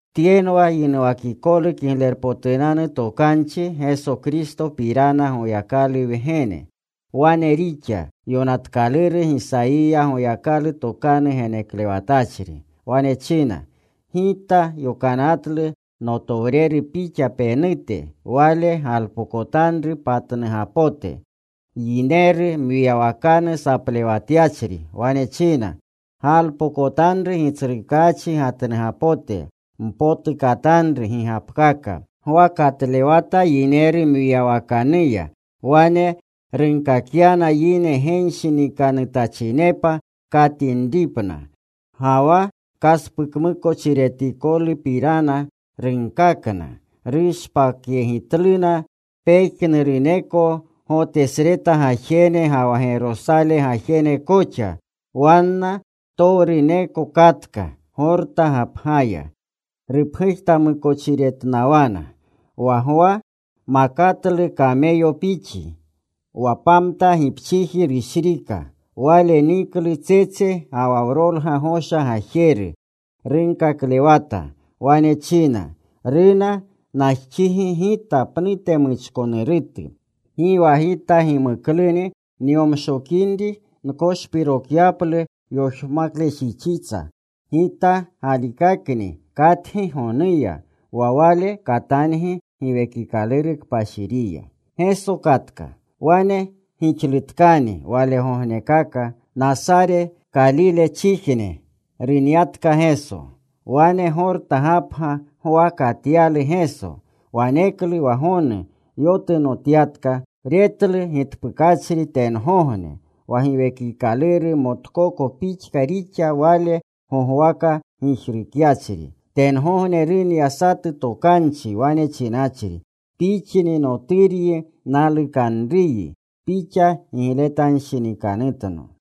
Tyenwa yinuwakikolu Kiglerpotunanu Tokanchi Geso Kristopirana Goyakalu Wgene. Wane rixa yokanatkaluru Gisayiya Goyakalu tokanu geneklewatachri. Wane china: Gita yokanatlu notowreru pixa penute. Wale galpokotanru patnugapote. Yineru mwiyawakanu saplewatyachri wane china: Galpokotanru Gitsrukachi gatnugapote. Mpotukatanru gigapkaka. Gwa katlewata yineru mwiyawakanuya. Wane runkakyana yine genshinikanutachinepa katinripna. Ga wa kaspukamukochiretikolupapirana runkakna. Rushpakyegitluna pejnuruneko Gotesreta gajene ga wa Gerosale gajene koxa. Wanna ptowruneko katka Gorta gapgaya. Rupgujtamukochiretnawana. Wa Gwa makatlu kameyopixi. Wa pamta gipchiji rushrika. Wale niklu tsetse ga wa wrolga gosha gajeru. Runkaklewata. Wane china, “Runa najxigi Gita pnute muchkonurutu. Gi wa Gita gimukluni nyomshokinri nkoshpirokyaplu yoshmaklejixitsa. Gita galikakni katgi gonuya. Wa Wale katangi Giwekikaluru Kpashiriya.” Wane gixlutkani walegognekaka. Nasare Kalilechijne runyatka Geso. Wane Gorta gapga Gwa katyalu Geso. Waneklu wa gonu yotunotyatka. Retlu gitpukachri tengogne, wa Giwekikaluru motkoko pixka rixa, Wale gogwaka gijrukyachri. Tengogne runya satu tokanchi wane chinachri, “Pixni Noturyi nalukanruyi. Pixa gigletanshinikanutno.”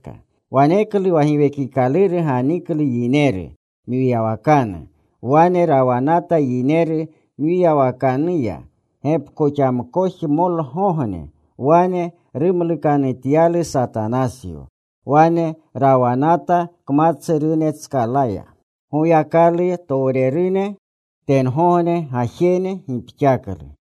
Waneklu wa Giwekikaluru ganiklu yineru mwiyawakanu. Wane rawanata yineru mwiyawakanuya gepkoxamkojemolgogne. Wane rumlukanutyalu Satanasyo. Wane rawanata kmatsurunetskala. Goyakalutowrerune tengogne gajene gipxaklu.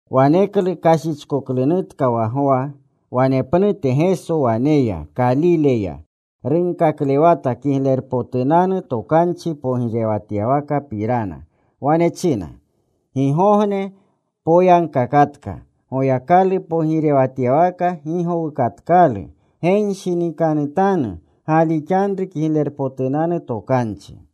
Waneklu kashichkoklunutka wa Gwa. Wanepnute Geso wane ya, Kalile ya. Runkaklewata Kiglerpotunanu Tokanchi pogirewatyawakapirana. Wane china, “Gigogne poyagkakatka. Goyakalu pogirewatyawaka gi gowukatkalu. Genshinikanutanu. Galixanru Kiglerpotunanu Tokanchi.”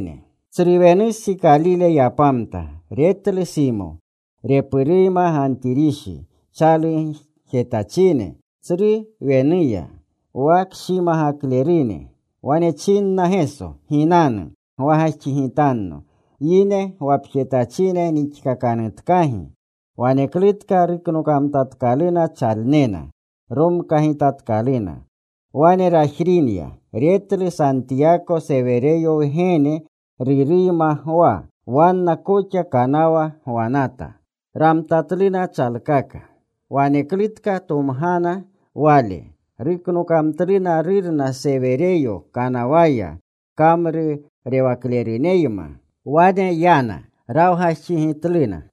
Tsru wenustsi Kalile yapamta. Retlu Simo repuruyma Gantirishi, chalugjetachine tsru wenuya, wa kshimagaklerune. Wane chinna Geso, “Ginanu gwagajxigitanno. Yine gwapjetachine nixkakanutkagi.” Waneklutka ruknokamtatkaluna chalnena. Romkagitatkaluna. Wane rajrinya. Retlu Santiyako, Sewereyo wgene repuruyma Gwa. Wanna koxa kanawa gwanata. Ramtatluna chalkaka. Waneklutka tomgana Wale. Ruknokamtluna rurna Sereweyo kanawaya kamrurewakleruneyma. Wane yana. Rawgajxigitluna.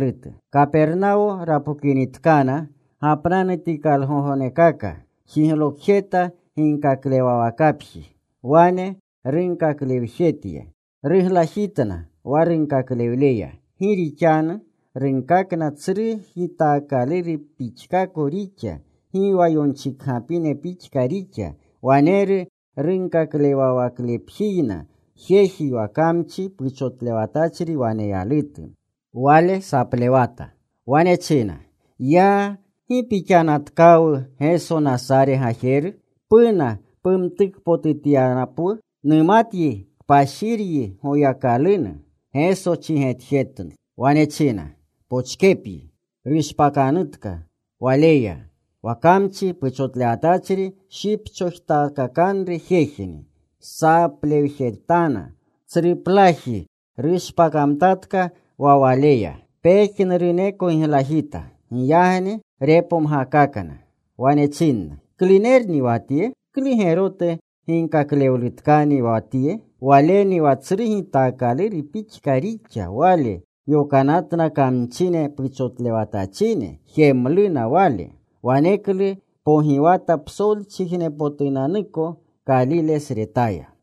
Kapernawo rapokinitkana, gapnanutikalurugognekaka jiglokjeta ginkaklewawakapji. Wane runkaklewlejetya. Ruglajitna wa runkaklewleya. Gi rixanu runkakna tsru gitaakaluru pixkako rixa. Gi wa yonchikgapine pixka rixa. Waneru runkaklewawaklepjiyna jeji wa kamchi puchotlewatachri waneyalutu. Wale saplewata. Wane china, “¡Ya! ¿Gi pixannatkawu Geso Nasare gajeru? ¿Puna pumtukpotutapyapwu? Numatyi Kpashiryi Goyakalunu.” Geso chigetjetlu. Wane china, “Pochkepyi. Pushpakanutka waleya.” Wa kamchi puchotlewatachri shipchojtakakanru jejni. Saplewjetana tsruplaji. Rushpakamtatka wa waleya. Pejnuruneko giglajita. Giyagni repomgakakna. Wane chinna, “¿Klunerni wa tye? ¿Klu gerotu ginkaklewlutkani wa tye? ¡Waleni wa tsru gitaakaluru pixka rixa! Wale yokanatna kamchine puchotlewatachine. Jemluna Wale.” Waneklu pogiwata psolchijnepotunanuko Kalilesretaya.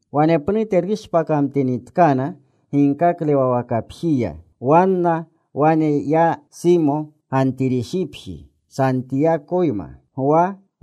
Wanepnute rushpakamtinitkana ginkaklewawakapjiya, wanna wane yana Simo, Gantirishipji, Santiyakoyma, Gwa koxa.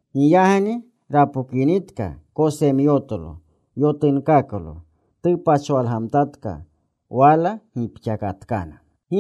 Giyagni rapokinitka kosemyotlo, yotunkaklo. Tupachwalgamtatka. Wala gipxakatkana.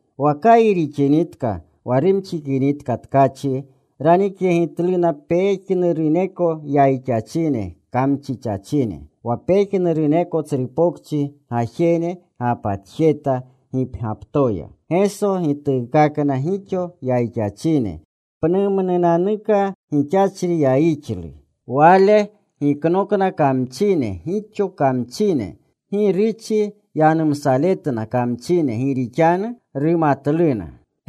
Wa kayi rixinitka wa rumxikinitka tkachi ranikyegitluna pejnuruneko yayixachine, kamchichachine. Wa pejnuruneko tsru pokchi gajene gapatjeta gipgyaptoya. Geso gituukakna gixo yayixachine pnumnunanuka gixachri yayixluya. Wale giknokna maleka gixo kamchine. Gi ruchi yanumsaletna kamchine, gi rixanu rumatluna.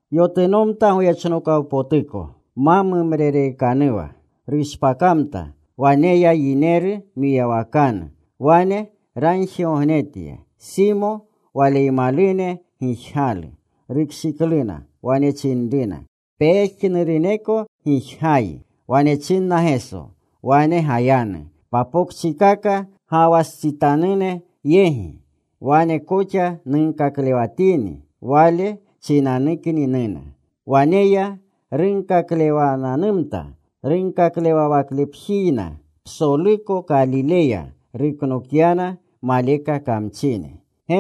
Yotunomta goyechnokawpotuko, ma mumrereekanuwa. Rushpakamta. Wane ya yineru mwiyawakanu. Wane ragjigognetya. Simo, waleymalune gijgalu. Rukshikluna. Wane chinruna, “Pejnuruneko gijgayi.” Wane chinna Geso, “Wane gayanu papokchikaka gawastsitanune yegi. Wane koxa nunkaklewatini. Wale chinanukni nuna.” Wane ya. Runkaklewananumta runkaklewawaklepjikakayna psoluko Kalileya. Ruknokyana maleka kamchine.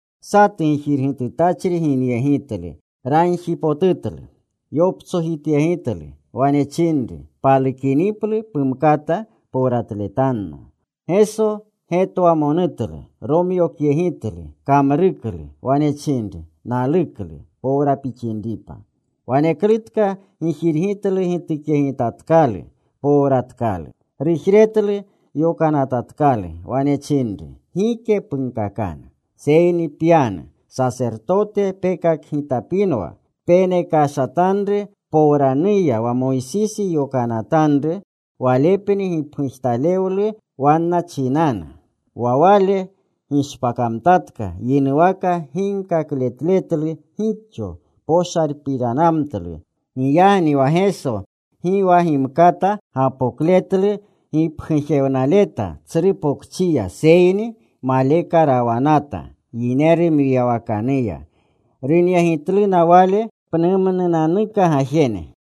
Satu gijirgitutachri ginyegitlu. Ragjipotutlu. Yoptsojityegitlu. Wane chinru, “Palukiniplu pumkata powratletno.” Geso getwamonutlu. Romyokyegitlu. Kamruklu. Wane chinru, “Naluklu. Powra pixinripa.” Waneklutka gijirgitlu gitukyegitatkalu. Powratkalu. Rujretlu. Yokanatatkalu. Wane chinru, “Gike punkakanu. Seyni pyanu. Sasertote pekakgitapinwa. Penekashatanru powranuya wa Moysisi yokanatanru. Walepni gipgujtalewlu wanna chinanu.” Wa wale gishpakamtatka. Yinuwaka ginkakletletlu gixo. Poshalpiranamtlu. Giyagni wa Geso gi wa gimkata gapokletlu gipgujewnaleta tsru pokchiya, seyni maleka rawanata yineru mwiyawakanuya. Runyegitluna Wale pnumnunanuka gajene.